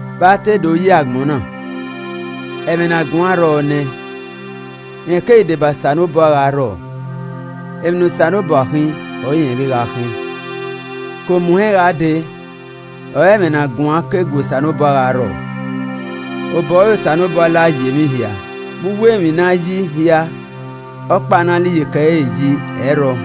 Vbe a te do yi agbọn na, Ẹmwẹ ne a guan rrọọ nẹ, rẹn keghi deba Osanobua gha rrọọ, emwi ne Osanobua khin ọre irẹn vbe gha khin. Ke omuhẹn gha dee, ọre ẹmwẹ ne a guan ke gu Osanobua gha rrọọ. Obọ ẹre Osanobua la yi emwi hia. Vbe uwu emwi ne a yi hia, ọkpa ne a la iyeke ẹre yi, ẹ i rrọọ.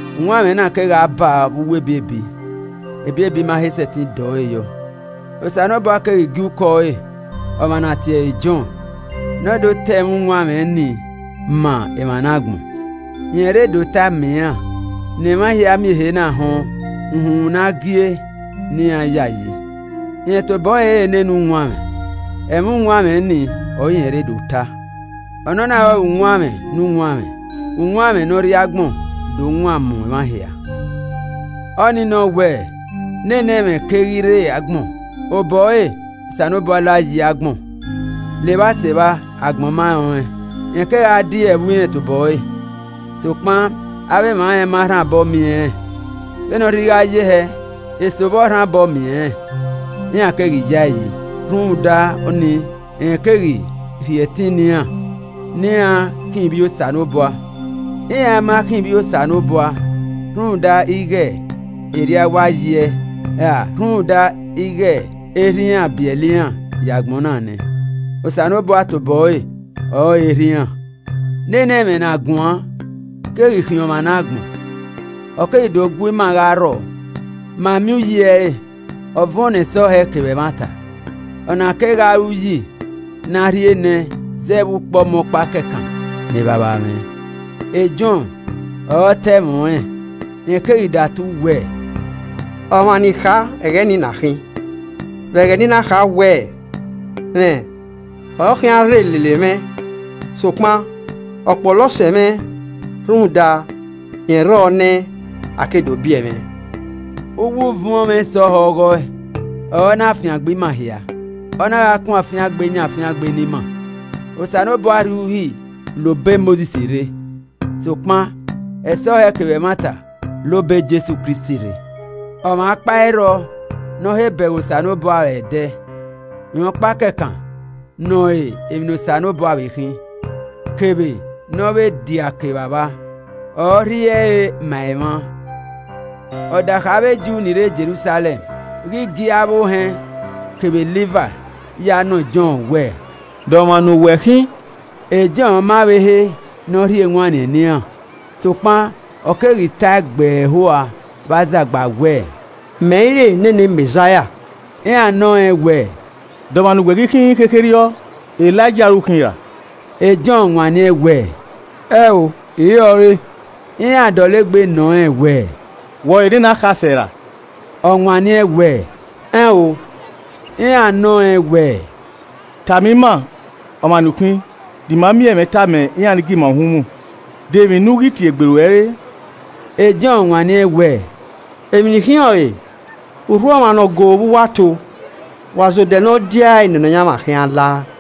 Uwanmwẹ na kegha baa vbe uwu ebiebi, ebiebi ma he sẹtin dọ ẹre yọ. Osanobua keghi gie ukọ ẹre, ọmwa ne a tie ẹre Jọn. Ne ọ do ta ẹmwẹ uwanmwẹ nii na emwa ne agbọn. Rẹn rre do tae ma iran, ne emwa hia miẹn ehe na họn uhunmwu ne a gie ne iran yayi. Rẹn tobọ ẹre i re nene uwanmwẹ, ẹmwẹ uwanmwẹ ni ọre irẹn re do ta. Ọnọna ọrọre uwanmwẹ ne uwanmwẹ, uwanmwẹ ne ọ rrie agbọn do wan mu emwa hia. Ọnii nọ wẹ, nene Ẹmwẹ keghi rre agbọn, obọ ẹre ọre Osanobua la yi agbọn, levba sevba, agbọn ma rẹn ọnrẹn. Rẹn kegha die ẹvbo irẹn tobọ ẹre, sokpan avbe emwa rẹn ma rhan obọ miẹn rẹn. Vbene ọ rhirhi gha ye hẹ, eso vbọ rhan obọ miẹn rẹn, iran keghi yaeyi, rhunmwuda ọnii, rẹn keghi rhie ẹtin ne iran ne iran khian ivbi Osanobua. Iran ma khian ivbi Osanobua rhunmwuda ighe erriọ a wa yi ẹe, ra rhunmwuda ighe erha iran biẹlẹ iran ye agbọn na nẹ, Osanobua tobo ẹre ọrọre Erha iran. Nene Ẹmwẹ ne a guan keghi khian ọmwa ne agbọn, ọ keghi do gu ima gha rrọọ. Ma miẹn uyi ẹre, ọ vuọn ne ẹsọhẹ kevbe ẹmwata. Ọ na kegha re uyi ne a rhie nẹẹn zẹ vbe ukpọmọkpa kẹkan ne Evbavba mwẹ. Jọn ọre ọ ta ẹmwẹ ọnrẹn. Rẹn keghi datu wẹẹ, “Ọmwa ne I kha ẹghẹ nii ọna khin vbe ẹghẹ ne I na kha wẹẹ, ‘Rẹn ọre ọ khian rre lele mwẹ, sokpan ọ kpọlọ sẹ mwẹ rhunmwuda rẹn rrọọ nẹ a ke do biẹ mwẹ.’” Uwu uvuọnmwẹ ẹsọhẹ ọghọe, ọre ọ na fiangbe ima hia, ọ na gha kun afiangbe yan afiangbe ne ima. Osanobua rhie Uhi la obọ Mosis rre, sokpan ẹsọhẹ kevbe ẹmwata la obọ Jesu Kristi rre. Ọmwa ọkpa i rrọ ne ọ he bẹghe Osanobua aro ẹdẹ, rẹn ọkpa kẹkan ne ọ re emwi ne Osanobua vbe khin, kevbe ne ọ vbe diake Evbavba, ọre ọ rhie ẹre ma emwa. Ọdakha avbe Ju ni rre Jerusalẹm ghi gie avbe ohẹn kevbe Livai ya nọ Jọn wẹẹ, “De ọmwa ne uwẹ khin?” Jọn ma vbe he ne ọ rhie ewanniẹn ne iran, sokpan ọ keghi tae gbẹe ẹho rua vbe azagba wẹẹ, “Mẹ i re nene Mẹzaia.” Iran nọ rẹn wẹẹ, “De ọmwa ne uwẹ ghi khin khekherriọ? Elaija ore u khin ra?” Jọn wanniẹn wẹẹ, “Ẹn ọ, I i re ọre.” Iran dọlegbe nọ rẹn wẹẹ, “Wẹ ọrọre nene Akhasẹ ra?” Ọ wanniẹn wẹẹ, “Ẹn o.” Iran nọ rẹn wẹẹ, “Tama ima ọmwa ne u khin ne ima miẹn ẹmwẹ tama iran ni gie ima uhunmwu. De emwi ne u ghi tie egbe ruẹ re?” Jọn wanniẹn wẹẹ, “Emwi ne I khin ọrọre: Urhu ọmwa ne ọ go vbe uwu ato wa ze odẹ ne ọ diae ne Nọyaẹnmwa khian la!”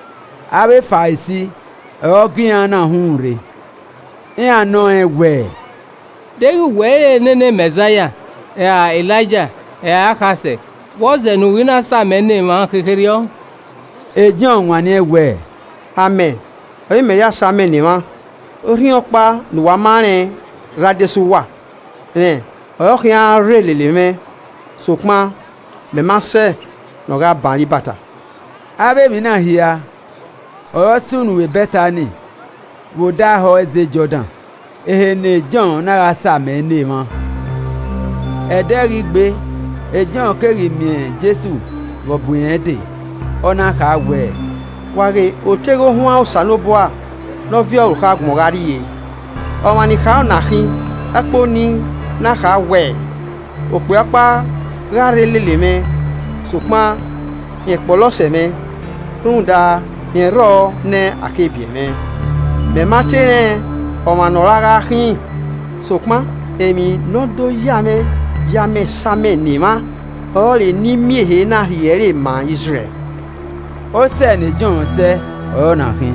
Avbe Farisi ọre ọ gie iran na uhunmwu rre. Iran nọ rẹn wẹẹ, “Deghẹ wẹ i re nene Mẹzaia, ra Elaija ra akhasẹ, vbọzẹ ne u ghi na same ne emwa khekherriọ?” Jọn wanniẹn wẹẹ, “Amẹ ọre I mẹ ya same ne emwa, orhiọnkpa ne uwa ma rẹn rre adesẹ uwa. Rẹn ọ re ọ khian rre lele mwẹ sokpan mẹ ma sẹ ne ọ gha ban re ibata.” Avbe emwi na hia ọre ọ sunu vbe Bẹtani vbe odẹ ahọ ẹzẹ Jọdan, ehe ne Jọn na gha same ne emwa. Ẹdẹ ghi gbe, Jọn keghi miẹn Jesu vbe ọ bu irẹn dee, ọ na kha wẹẹ, “Wa ghe oteghe ohuan Osanobua ne ọ viọ orukhọ agbọn gha rrie! Ọmwa ne I kha ọ na khin ẹkpo ne I na kha wẹẹ, ‘Okpia ọkpa gha rre lele mwẹ, sokpan rẹn kpọlọ sẹ mwẹ, rhunmwuda rẹn rrọọ nẹ a ke biẹ mwẹ,’ Mẹ ma te rẹn ọmwa ne ọ ra gha khin, sokpan emwi ne ọ do ya mwẹ ye amẹ same ne emwa ọrọre ne I miẹn ehe na rhie e ẹre ma Izrẹl.” Osẹe ne Jọn sẹẹ ọre ọna khin,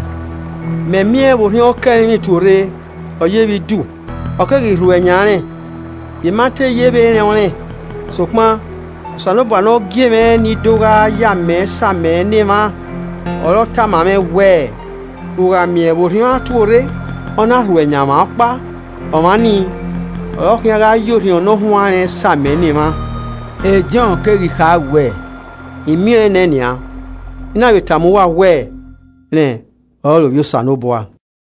“Mẹ miẹn vbe Orhiọn ke ẹrinmwi tuorre, ọ yevbe idu, ọ keghi rhuẹ yan rẹn. I ma te yevbe rẹn ọnrẹn, sokpan Osanobua ne ọ gie mwẹ ne I do gha ye amẹ same ne emwa ọre ọ tama mwẹ wẹẹ, ‘U gha miẹn vbe Orhiọn a tuorre, ọ na rhuẹ yan ọmwa ọkpa ọmwa nii ọre ọ khian gha ya Orhiọn Ne ọ huanrẹn same ne emwa.’ Jọn keghi kha wẹẹ, I miẹn ọẹn nẹ nian, I na vbe tama uwa wẹẹ rẹn ọrọre Ovbi Osanobua.”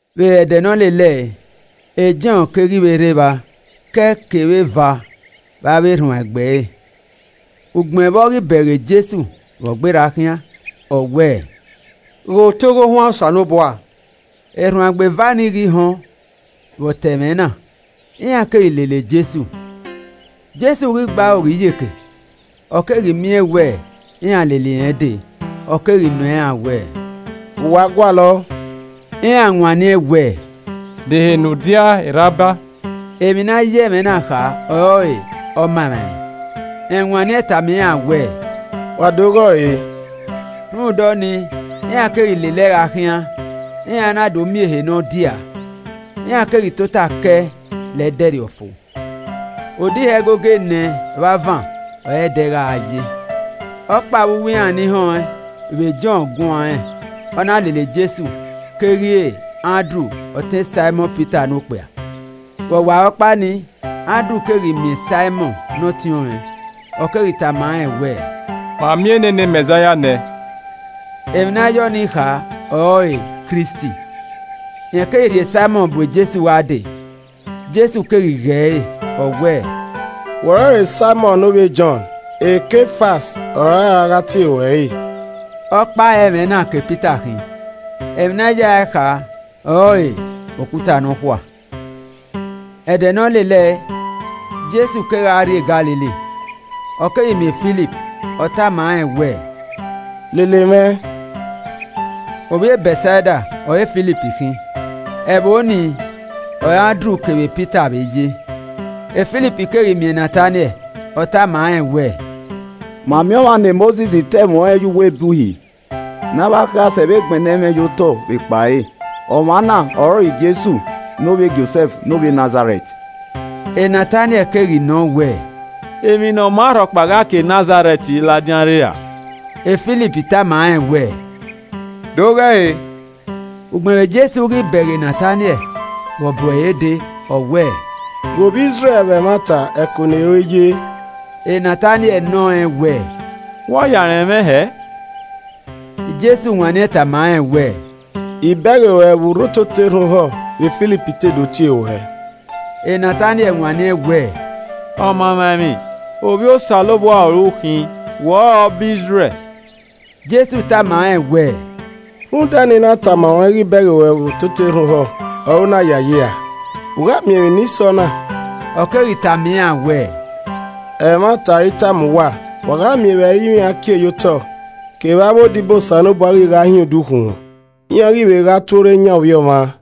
Vbe ẹdẹ ne ọ lele ẹe, Jọn keghi vbe rre evba ke ẹe kevbe eva vbe avbe erhuanegbe ẹre. Ugbẹn vbe ọ ghi bẹghe Jesu vbe ọ gberra khian, ọ wẹẹ, “Ghe Oteghe Ohuan Osanobua!” Erhuanegbe eva nii ghi họn vbe ọ ta ẹmwẹ na, iran keghi lele Jesu. Jesu ghi gbe aro ghe iyeke, ọ keghi miẹn wẹ iran lele irẹn dee, ọ keghi nọ iran wẹẹ, “Vbe uwa gualọ?” Iran wanniẹn wẹẹ, “De ehe ne u diaa e Rabai?” (Emwi ne a ya ẹmwẹ na kha ọrọre “Ọmamwaemwi.”) Rẹn wanniẹn tama iran wẹẹ. “Wa do ghe ọre.” Rhunmwuda ọnii, iran keghi lele ẹe gha khian, iran na do miẹn ehe ne ọ diaa. Iran keghi tota ke ẹe la ẹdẹrriọ fo. (Odẹ ihe ẹgogo enẹ vbe avan ọre ẹdẹ gha ye.) Ọkpa vbe uwu iran ni họn ẹn vbe Jọn guan rẹn, ọ na lele Jesu, keghi re Andru ọtẹn Saimọn Pita ne okpia. Vbe ọwarọkpa nii, Andru keghi miẹn Saimọn ne ọtiọnrẹn, ọ keghi tama rẹn wẹẹ, “Ma miẹn nene Mẹzaia nẹ.” (Emwi ne a ya ọnii kha ọrọre “Kristi.”) Rẹn keghi rhie Saimọn bu Jesu gha dee. Jesu keghi ghe ẹre, ọ wẹẹ, “Wẹ ọrọre Saimọn ne ovbi e Jọn, Kefas ọre a ra gha tie ruẹ re.” (Ọkpa ọre ẹmwẹ na ke Pita khin, emwi ne a yae kha ọrọre “Okuta nọkhua.”) Ẹdẹ ne ọ lele ẹe, Jesu kegha rrie Galili. Ọ keghi miẹn Filip, ọ tama rẹn wẹẹ, “Lele mwẹ.” ( Ovbi e Bẹtsaida ọre Filip khin, ẹvbo ni ọre Andru kevbe Pita vbe ye.) Filip keghi miẹn Nataniẹl, ọ tama rẹn wẹẹ, “Ma miẹn ọmwa ne Mosis ta ẹmwẹ ọnrẹn ye uwu ebe Uhi, ne avbe akhasẹ vbe gbẹnnẹ ẹmwẹ ye otọ vbe ekpa ẹre. Ọmwa na ọrọre Jesu ne ovbi e Josẹf ne ovbi e Nazarẹt.” Nataniẹl keghi nọ wẹẹ, “Emwi ne ọ maa rhọkpa gha ke Nazarẹt ladian rre ra?” Filip tama rẹn wẹẹ, “Do ghe ẹre.” Ugbẹn vbe Jesu ghi bẹghe Nataniẹl Vbe ọ bu ẹre dee, ọ wẹẹ, “Ghe Ovbi Izrẹl vbe ẹmwata, ẹko ne ero i ye.” Nataniẹl nọ rẹn wẹẹ, “Vbe u a ya rẹn mwẹ hẹe?” Jesu wanniẹn tama rẹn wẹẹ, “I bẹghe ruẹ vbe u rre ototọ erhan ohọ vbe Filip te do tie ruẹ.” Nataniẹl wanniẹn wẹẹ, “Ọmaemwaemwi, Ovbi Osanobua ọre u khin, wẹ ọrọre Ọba Izrẹl.” Jesu tama rẹn wẹẹ, “Rhunmwuda ne I na tama ruẹn ighe I bẹghe ruẹ vbe ototọ erhan ohọ ọre u na yayi ra? U gha miẹn emwi ni sẹ ọna.” Ọ keghi tama iran wẹẹ, “Ẹmwata ọre I tama uwa, wa gha miẹn vbe ẹrinmwi a kie ye otọ kevbe avbe odibo Osanobua ghi gha hin odukhunmwu, iran ghi vbe gha tuorre yan Ovbi Ọmwa.”